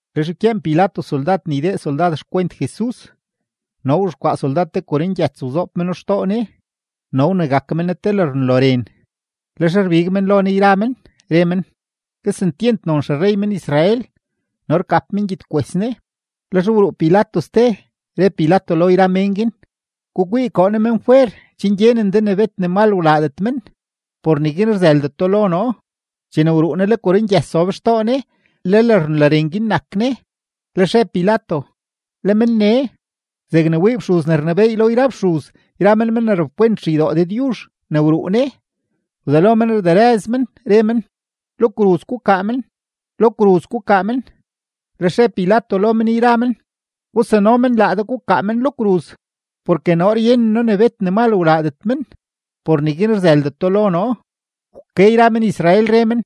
Lex wkyeen Pilato soldad ne ydee soldad xkwent Jesus. No wzhexkwaa soldad te korongyëts wzoob meno xtoo Ne, no wnegak men Ne te lërnloren. Lex rbig men lo Ne yra men, re men: ―¡Kesentyent non xerrey men-Israel! No rgap men gyedkwes Ne. Lex wruu Pilato ste, re Pilato lo yra mén guin: ―Gukwii, koo noo men fwer chen gyenen de ne bet ne mal wlaadet men, por neguin rzëldeto lo noo. Chene wruu Ne, le korongyëts zob xtoo Ne, le lërnloren guin nak Ne. Lex re Pilato: ―¡Le men nee! Zegne wii fxuz ne rnebééy lo yra fxuz yra men men ne rapkwent xeydoo Dëdyuzh ne wruu Ne, wzelo men rderëz men, re men: ―¡Lo kruz gukaa men! ¡Lo kruz gukaa men! Lex re Pilato lo men yra men: ―Gusano men laa de gukaa men lo kruz, porke noo ryenen noo ne bet ne mal wlaadet men, por neguin rzëldeto lo noo. Wke yra men-Israel, re men: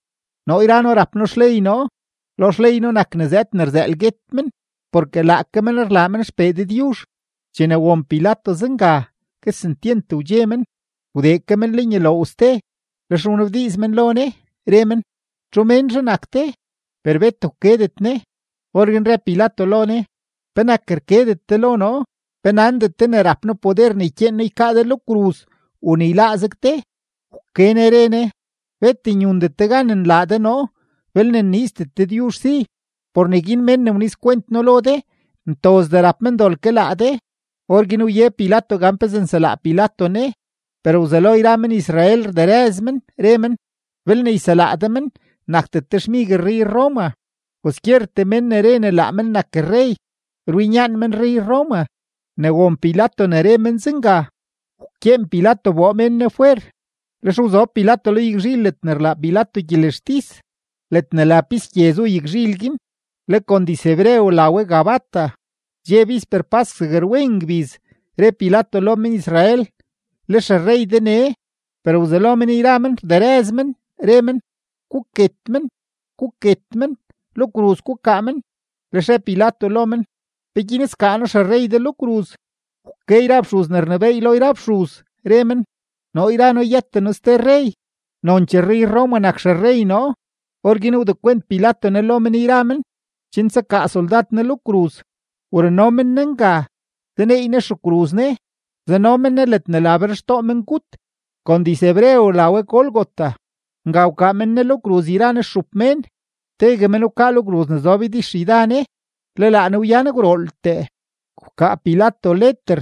―Noo yra noo rap noo xley noo; lo xley noo nak ne zëëd ne rzëël guet men, porke laake men rlaa men XPee Dëdyuzh. Chene won Pilato zenga, kesentyent wdxe men. Wdee ke men lenyuloow ste, lex wnabdiiz men lo Ne, re men: ―¿Txu ménzhe nak de? Per bet wkedet Ne. Orguin re Pilato lo Ne: ―¿Penak rkedet de lo noo? ¿Pe nandet de ne rap noo poder ne ykyeen noo ykaa de lo kruz u ne yláá zeg de? Wke Ne re Ne: ―Bet nyundet de gan nlaa de noo, belne nniizdet Dëdyuzh si. Por neguin mén ne wnizkwent noo lo de, ntozdee rap men dol ke laa de. Orguin wye Pilato gan pezee nselaa men Ne; per wzelo yra men-Israel rderëz men, re men: ―¡Belne yselaa de men, nakdet de xmig rrey-Roma! Kwaskyertee men ne re laa men nak rrey, rwinyaan men rrey-Roma. Ne won Pilato ne re men zenga, wkyeen Pilato wboo mén Ne fwer. Lex wzob Pilato lo yagzhil ledne rlaa Pilato gyelextis; ledne la Pis Gye zu yagzhil guin, le kon diz-hebreo la we Gabata. Dxe bisper pask zeg rwen ngbiz, re Pilato lo men-Israel: ―Le xerrey de nee. Per wzelo men yra men rderëz men, re men: ―¡Guket men! ¡Guket men! ¡Lo kruz gukaa men! Lex re Pilato lo men: ―¿Peguin skaa noo xerrey de lo kruz? Wke yra fxuz ne rnebééy lo yra fxuz, re men: ―Noo yra noo yëten noo ste rrey, nonchee rrey-Roma nak xerrey noo. Orguin wdekwent Pilato Ne lo men yra men, chen tsakaa soldad Ne lo kruz. Wruno men Jesus nga, zaneey Ne xekruz Ne, zano men Ne ledne la Berxtoo Mengut, kon diz-hebreo la we Gólgota. Nga wkaa men Ne lo kruz yra Ne stxup mén, tegue men wkaa lo kruz ne zob ydixyda Ne, le laa Ne wyan gwrooltee. Wkaa Pilato leter,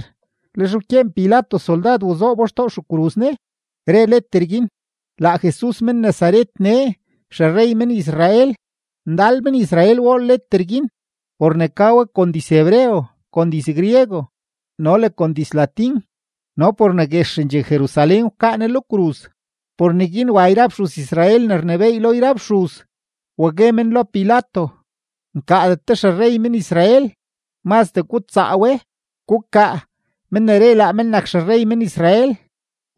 lex wkyeen Pilato soldad wazoobo xtoo xekruz Ne, re leter guin: “Laa Jesus men-Nazaret nee, xerrey men-Israel.” Ndal men-Israel wool leter guin por ne ka we kon diz-hebreo, kon diz-griego, no le kon diz-latín no por ne guexendxee Jerusalén wkaa Ne lo kruz. Por neguin wa yra fxuz-Israel ne rnebééy lo yra fxuz, wa gue men lo Pilato: ―Nkaadet de “Xerrey men-Israel”, mazdee gutsaa we, gukaa “Men ne re laa men nak Xerrey men-Israel.”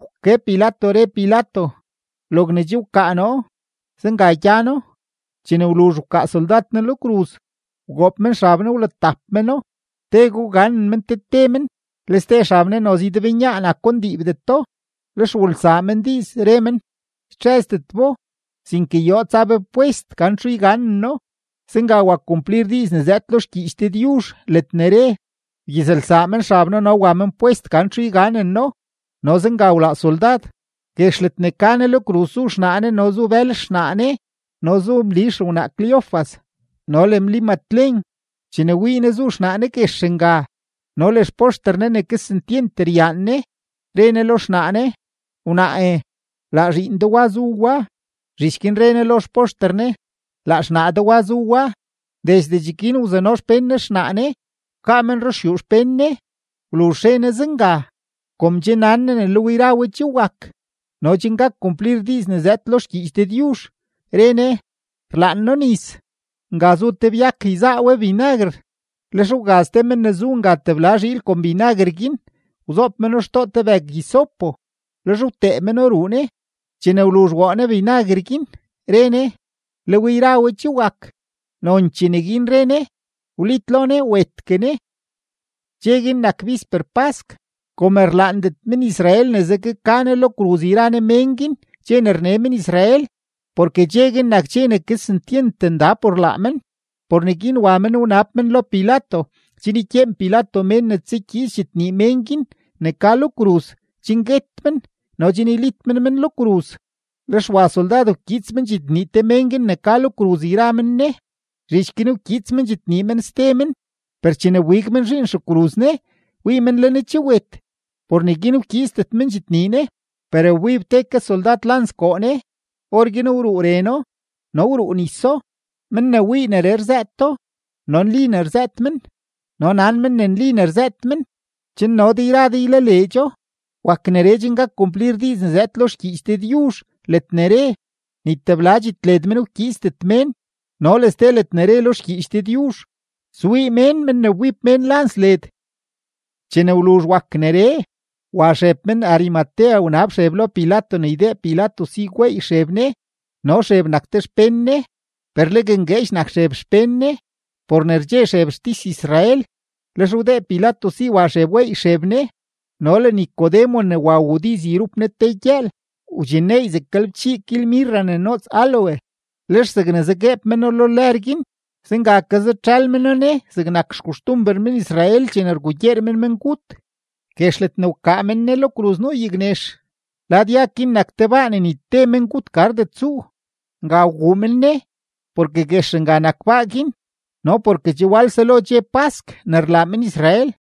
Wke Pilato, re Pilato: ―Logne che wkaa noo, zenga gyano. Chene wluzh wkaa soldad Ne lo kruz, wgoob men xab Ne, wlatap meno, tego wganen men te te men. Le ste xab Ne noze ydebnyaa nako ndiibdeto, lex wulsaa men diiz, re men: ―Ytxëzdet bo, sinke yoo tsa be pwest gan txuzh yganeno. Zenga wak kumplir diiz ne zëëd lo xgyiich Dëdyuzh ledne re: “Wgyizlsaa men xab noo no wa men pwest gan txuzh yganeno.” No zenga wlaa soldad. Guex ledne ka Ne lo kruz zu xnaa Ne no zu bël xnaa Ne no zu Mli xewnaa Cleofas no le Mli Matlen. Chene wii Ne zu xnaa Ne guex nga no le xpoxter Ne ne kesentyent ryaan Ne, re Ne lo xnaa Ne: ―Wnaae, laa zhiin de wa zu wa. Zhich guin re Ne lo xpoxter Ne: ―Laa xnaa de wa zu wa. Desde cheguin wzano xpén Ne xnaa Ne wkaa men ruxyuu xpén Ne. Wluzh re Jesus zenga, kom che nan Ne ne le we yra we che wak, no chen gak kumplir diiz ne zëëd lo xgyiich Dëdyuzh, re Ne: ―Rlaan noo nis. Nga zu te byak yzaa we binaguer; lex wgaz te men ne zu nga tebla zhiil kon binaguer guin, wzoob meno xtoo te bëg-hisopo, lex wtee meno ruu Ne. Chene wluzh woo Ne binaguer guin, re Ne: ―Le we yra we che wak. Nonchee neguin re Ne, wlitlo Ne, wetgue Ne. Dxe guin nak bisper pask. Kom rlaandet men-Israel ne zegue ka Jesus lo kruz yra Ne mén guin dxe ne rne men-Israel, porke dxe guin nak dxe ne kesentyent nda por laa men, por neguin wa men wanab men lo Pilato chen ykyeen Pilato mén ne tsakyiits dxitnii mén guin ne ka lo kruz chen guet men no chen ylit men men lo kruz. Lex wa soldad wkyiits men dxitnii te mén guin ne ka lo kruz yra men Ne; zhich guin wkyiits men dxitnii men ste men. Per chene wbig men zhiin xekruz Ne, wii men le Ne che wet. Por neguin wkyiitsdet men dxitnii Ne. Per wbib te ke soldad lans koo Ne, orguin wruu reno no wruu niso. Men ne wii neree rzëëto, no nli ne rzëët men, no nan men ne nli ne rzëët men chen no de yra de ylaleedxo. Wak neree chen gak kumplir diiz ne zëëd lo xgyiich Dëdyuzh ledne re: “Ni tebla dxitled men ykyiitsdet mén”, no le ste ledne re lo xgyiich Dëdyuzh: “Swii mén men ne wbib mén lans led.” Chene wluzh wak neree, wa Xeb men-Arimatea wnab Xeb lo Pilato ne ydee Pilato si gweey Xeb Jesus. No Xeb nak te xpén Ne, per legue ngueedx nak Xeb xpén Ne, por ne rdxe Xeb xtis-Israel. Lex wdee Pilato si wa Xeb weey Xeb Ne. No le Nicodemo ne wa wuu diiz yrup Ne te gyëël, wdxinneey zeg galebchii kil mirra ne noots áloe; lex zegne zagueeb meno lo lër guin, zenga ke zatxël meno Ne zegnak xkoxtumber men-Israel chene rgugyeer men mengut. Guex ledne wkaa men Ne lo kruz nuu yagnex; lad yag guin nak te baa ne ni te mengut gardet tsuu. Nga wguu men Ne, porke guex nga nak baa guin no porke che wal selo dxe pask ne rlaa men-Israel.